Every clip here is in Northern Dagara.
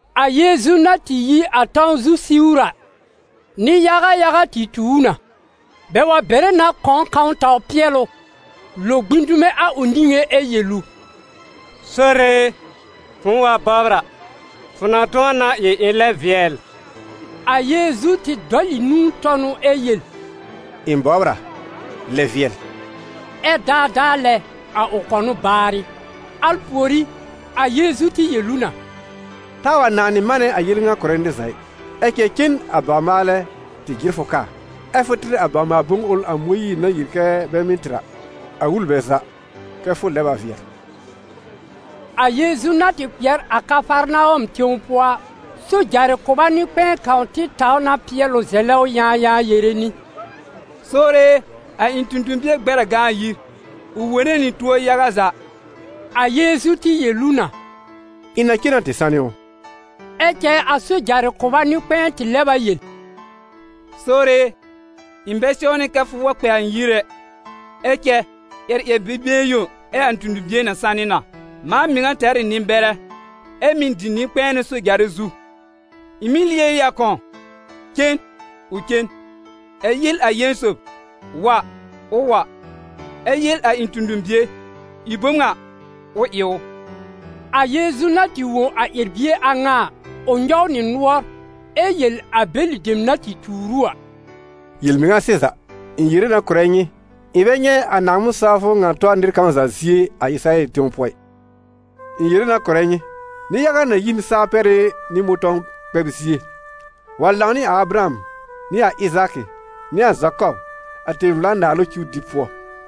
A Yeezu na tɩ yi a tãw zu siwr a, nɩ-yaga yaga tɩ tu ʋ na. Bɛ wa bere na kɔ̃w kãw taw pɩɛl ʋ, lo gbĩ dume a ʋ niŋé ɛ yel ʋ: «Sore e, fʋ̃ʋ wa bɔbr a, fʋ na tʋ̃ɔ na ɩ ɩ̃ lɛb vɩɛl.» A Yeezu tɩ dɔl ɩ nũu tɔ n ʋ ɛ yel: «Ɩ̃ bɔbr a, lɛb vɩɛl.» Ɛ daadaa lɛ, a ʋ kɔnʋ baarɩ. Al pùorí, a Yeezu tɩ yel ʋ na: «Taa wa nanɩ manɛ a yel ŋa kʋ̀rɛ nɩr za ɩ. Ɛ cɛ cen a bawr-maalɛ tɩ jɩr fʋ kaa, ɛ fʋ tɩr a bawr-maal-bom ʋl a Mõyiir na yel kɛ bɛ mɩ́ tɩr a, a wul bɛ za kɛ fʋ lɛb a vɩɛl.» A Yeezu na tɩ kpɩɛr a Kafarnawɔm tẽw pʋɔ a, sojarɩ kʋba nɩ-kpɛ̃ɛ kãw tɩ taw na pɩɛl ʋ zɛlɛ ʋ yãayãa yere nɩ: «Sore e, a ɩ̃ tõ-tõ-bie gbɛr a gã a yir, ʋ wone nɩ tuo yaga za.» A Yeezu tɩ yel ʋ na: «Ɩ̃ na cen na tɩ sanɩ ʋ.» Ɛ cɛ a sojarɩ kʋba nɩ-kpɛ̃ɛ tɩ lɛb a yel: «Sore e, ɩ̃ bɛ sɛwnɩ kɛ fʋ wa kpɛ a ɩ̃ yir ɛ, ɛ cɛ ƴɛr ƴɛr-bi-been yõ ɛ a ɩ̃ tõ-tõ-bie na sanɩ na. Mãa mɩŋa tɛr ɩ nɩ-bɛrɛ, ɛ mɩ̀ dɩ nɩ-kpɛ̃ɛnʋ sojarɩ zu. Ɩ̃ mɩ́ yel ɩ a kãw: ‹Cen›, ʋ cen; ɛ yel a ƴẽn sob: ‹Wa›, ʋ wa, ɛ yel a ɩ̃ tõ-tõ-bie: ‹Ɩ bom ŋa›, ʋ ɩ ʋ.» A Yeezu na tɩ wõ a ƴɛr-bie a ŋa a, ʋ nyɔw nɩ nʋɔr, ɛ yel a bɛlɩ dem na tɩ tuur ʋ a: «Yel-mɩŋa sɩza, ɩ̃ yere na kʋ̀rɛ nyɩ: ɩ̃ bɛ nyɛ̃ a Naaŋmɩn-sawfʋ ŋa tɔ nɩr kãw za zie a Ɩsɩrayɛl tẽw pʋɔ ɩ. Ɩ̃ yere na kʋ̀rɛ nyɩ, nɩ-yaga na yi n saa-pɛrɩ́ nɩ mʋ̃tɔ̃w-kpɛb-zie wa lãw nɩ a Abraham nɩ a Ɩzaakɩ nɩ a Zakɔb a tẽ-vla-naalʋ cuw dɩb pʋɔ,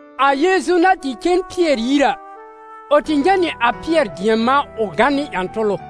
A Yeezu na tɩ cen Pɩɛr yir a, ʋ tɩ nyɛ̃ nɩ a Pɩɛr dɩɛm-mã ʋ gã nɩ ƴã-tʋlʋ.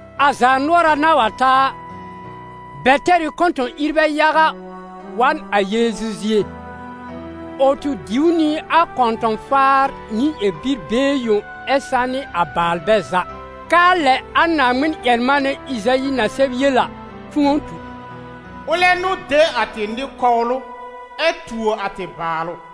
A zaanʋɔra na wa ta a, bɛ tɛr ɩ kɔ̃tɔ̃-ìrbɛ yaga wa n a Yeezu zie; ʋ tɩ diw nɩ a kɔ̃tɔ̃-faar nɩ ƴɛr-bi-been yõ ɛ sanɩ a baalbɛ za, k'aa lɛ a Naaŋmɩn-ƴɛr-manɛ Ɩzayi na sɛb yel a, tʋ̃ɔ tu: «Ʋlɛ n'ʋ de a tɩ nɩ-kɔwlʋ, ɛ tuo a tɩ baalʋ.»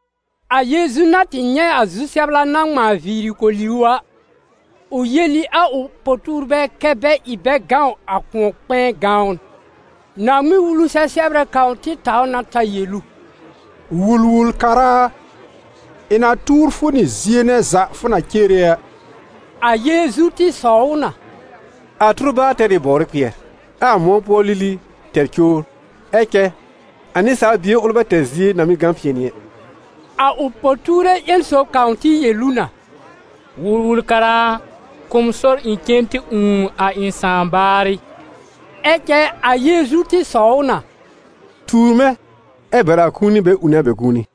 A Yeezu na tɩ nyɛ̃ a zu-sɛbla na ŋmãa viiri koli ʋ a, ʋ yel ɩ a ʋ po-tuurbɛ kɛ́ bɛ ɩ bɛ gãw a kʋ̃ɔ-kpɛ̃ɛ gãwn. Naaŋmɩn-Wulu sɛ-sɛbrɛ kãw tɩ taw na ta yel ʋ: «Wul-wul-kara a, ɩ̃ na tuur fʋ nɩ zie nɛ za fʋ na cere a.» A Yeezu tɩ sɔw ʋ na: «A tʋrbaar tɛr ɩ bɔwrɩ kpɩɛr, ɛ a mʋ̃ɔ pʋɔ lili tɛr cowr, ɛ cɛ a Nɩsaal Bie ʋl bɛ tɛr zie na mɩ́ gã pɩ̃ɛnɩ ɛ.» A ʋ po-tuure ƴẽn sob kãw tɩ yel ʋ na: «Wul-wul-kara a, kʋ̀ m sɔr ɩ̃ cen tɩ ũù a ɩ̃ sãà baarɩ.» Ɛ cɛ a Yeezu tɩ sɔw ʋ na: «Tuur mɛ̃, ɛ bɛr a kũuni bɛ ũune a bɛ kũuni.»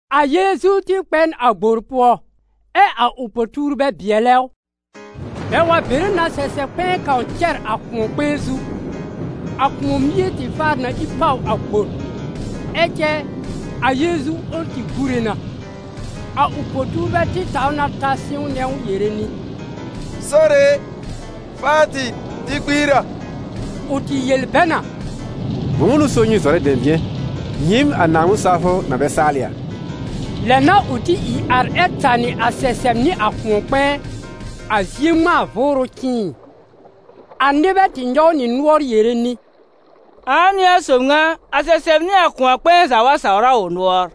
A Yeezu tɩ kpɛ n a gbor pʋɔ, ɛ a ʋ po-tuurbɛ bɩɛlɛ ʋ. Bɛ wa bere na sɛsɛ-kpɛ̃ɛ kãw cɛr a kʋ̃ɔ-kpɛ̃ɛ zu, a kʋ̃ɔ mie tɩ faar na ìr pàw a gbor. Ɛ cɛ a Yeezu ʋl tɩ gúre na. A ʋ po-tuurbɛ tɩ taw na ta sɩ̃wnɛ ʋ yere nɩ: «Sore e, faa tɩ, tɩ kpiir a!» Ʋ tɩ yel bɛ na: «Bʋ̃ʋ n'ʋ so nyɩ zɔrɛ dɛ̃bɩ̃ɛ, nyɩɩm a Naaŋmɩn-sawfʋ na bɛ saalɩ a?» Lɛ n'a ʋ tɩ ìr ar ɛ tanɩ a sɛsɛb nɩ a kʋ̃ɔ-kpɛ̃ɛ, a zie ŋmãa vʋʋrʋ cɩ̃ɩɩ! A nɩbɛ tɩ nyɔw nɩ nʋɔr yere nɩ: «Ãa n'ɩ a sob ŋa, a sɛsɛb nɩ a kʋ̃ɔ-kpɛ̃ɛ za wa sawr a ʋ nʋɔr?»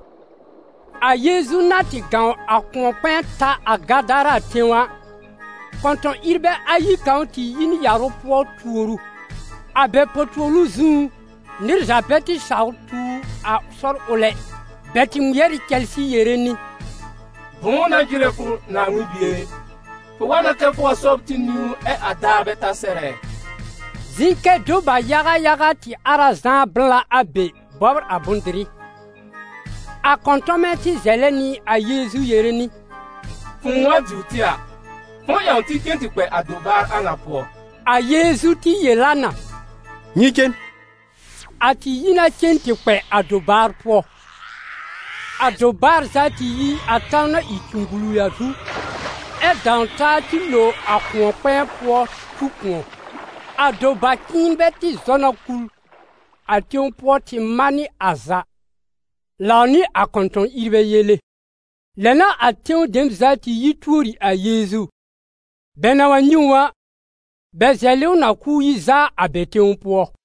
A Yeezu na tɩ gãw a kʋ̃ɔ-kpɛ̃ɛ ta a Gadara tẽw a, kɔ̃tɔ̃-ìrbɛ ayi kãw tɩ yi n yarʋ pʋɔ tuor ʋ. A bɛ po-tuolu zũú, nɩr za bɛ tɩ saw tuur a sɔr ʋl ɛ. Bɛ tɩ ŋmɩɛr ɩ cɛlsɩ yere nɩ: «Bʋ̃ʋ n'a jɩrɛ fʋ, Naaŋmɩn Bie e? Fʋ wa na kɛ fʋ wa sɔbr tɩ niwn ɛ a daar bɛ ta sɛr ɛ?» Zɩ̃ kɛ doba-yaga yaga tɩ ar a zãá blã a be bɔbr a bʋ̃-dɩrɩ. A kɔ̃tɔmɛ tɩ zɛlɛ nɩ a Yeezu yere nɩ: «Fʋ̃ʋ wa diwr tɩ a, fʋ̃ʋ ƴãw tɩ cen tɩ kpɛ a dobaar a ŋa pʋɔ.» A Yeezu tɩ yel a na: «Nyɩ cen.» A tɩ yi na cen tɩ kpɛ a dobaar pʋɔ. A dobaar za tɩ yi a tãw na ɩ cũgbulu a zu, ɛ dãw taa tɩ lo a kʋ̃ɔ-kpɛ̃ɛ pʋɔ tu kʋ̃ɔ. A doba-cɩ̃ɩnbɛ tɩ zɔ na kul a tẽw pʋɔ tɩ manɩ a za, lãw nɩ a kɔ̃tɔ̃-ìrbɛ yele. Lɛ n'a a tẽw dem za tɩ yi tuori a Yeezu; bɛ na wa nyɛ̃ ʋ a, bɛ zɛlɩ ʋ na k'ʋʋ yi zaa a bɛ tẽw pʋɔ.